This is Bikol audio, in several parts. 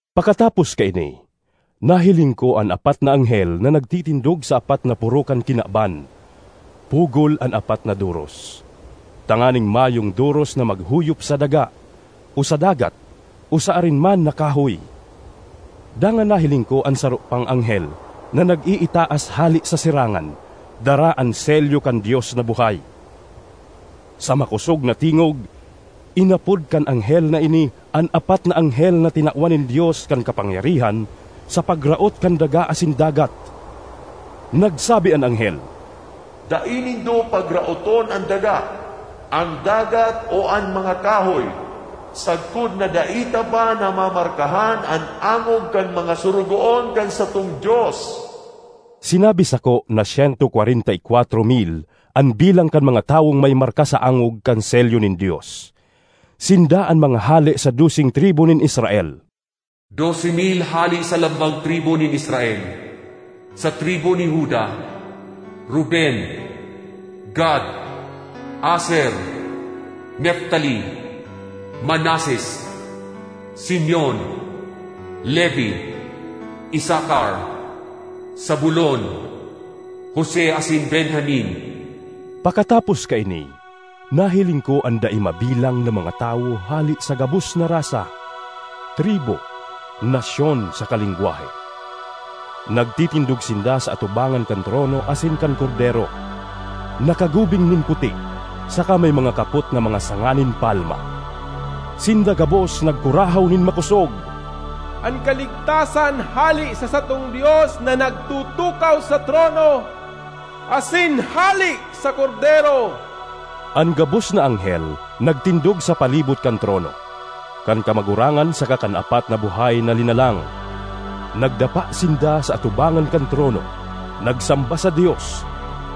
Pakatapos kaini, nahiling ko an apat na anghel na nagtitindog sa apat na poro kan kinaban, pugol an apat na doros, tanganing mayong doros na maghuyop sa daga, o sa dagat, o sa arin man na kahoy. Dangan nahiling ko an saro pang anghel na nag-iitaas hale sa sirangan dara an selyo kan Dios na buhay. Sa makosog na tingog inapod kan anghel na ini an apat na anghel na tinawan nin Dios kan kapangyarihan sa pagraot kan daga asin dagat. Nagsabi an anghel, “Dai nindo pagraoton an daga, an dagat, o an mga kahoy, sagkod na dai ta pa namamarkahan an angog kan mga sorogoon kan satong Dios.” Sinabi sako na syento kwarenta y kwatro mil an bilang kan mga tawong may marka sa angog kan selyo nin Dios. Sinda an mga hale sa doseng tribu nin Israel, dose mil hale sa lambang tribu nin Israel, sa tribu ni Juda, Ruben, Gad, Aser, Neftali, Manases, Simeon, Levi, Isacar, Zabulon, Jose asin Benjamin. Pakatapos kaini, nahiling ko an dai mabilang na mga tawo hale sa gabos na rasa, tribu, nasyon, saka lengwahe. Nagtitindog sinda sa atubangan kan trono asin kan Kordero, nakagubing nin puti saka may mga kapot na mga sanga nin palma. Sinda gabos nagkurahaw nin makosog, “An kaligtasan hale sa satong Dios na nagtutukaw sa trono, asin hale sa Kordero!” An gabos na anghel nagtindog sa palibot kan trono, kan kamagurangan saka kan apat na buhay na linalang. Nagdapa sinda sa atubangan kan trono, nagsamba sa Dios,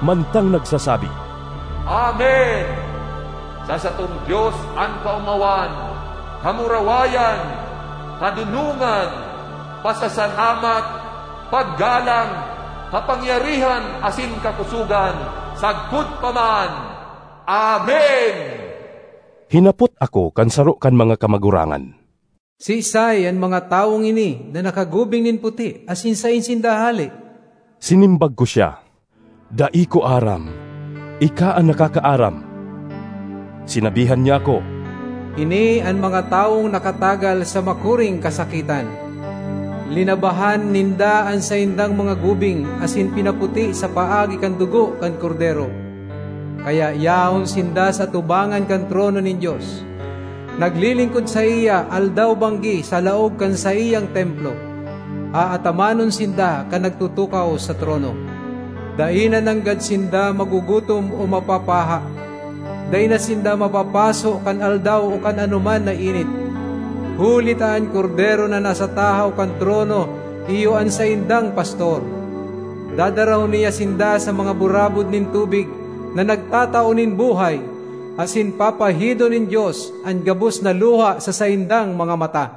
mantang nagsasabi, “Amen! Sa satong Dios an kaomawan, kamurawayan, kadonongan, pasasalamat, paggalang, kapangyarihan asin kakosogan sagkod pa man! Amen!” Hinapot ako kan saro kan mga kamagurangan, “Siisay an mga tawong ini na nakagubing nin puti asin saen sinda hale?” Sinimbag ko siya, “Dai ko aram; ika an nakakaaram.” Sinabihan niya ako, “Ini an mga tawong nakatagal sa makuring kasakitan. Linabahan ninda an saindang mga gubing asin pinaputi sa paagi kan dugo kan Kordero. Kaya yaon sinda sa atubangan kan trono nin Dios, naglilingkod saiya aldaw-banggi sa laog kan saiyang templo. Aatamanon sinda kan nagtutukaw sa trono. Dai na nanggad sinda magugutom o mapapaha; dai na sinda mapapaso kan aldaw o kan anoman na init, huli ta an Kordero na nasa tahaw kan trono iyo an saindang pastor. Dadarahon niya sinda sa mga burabod nin tubig na nagtatao nin buhay, asin papahidon nin Dios an gabos na luha sa saindang mga mata.”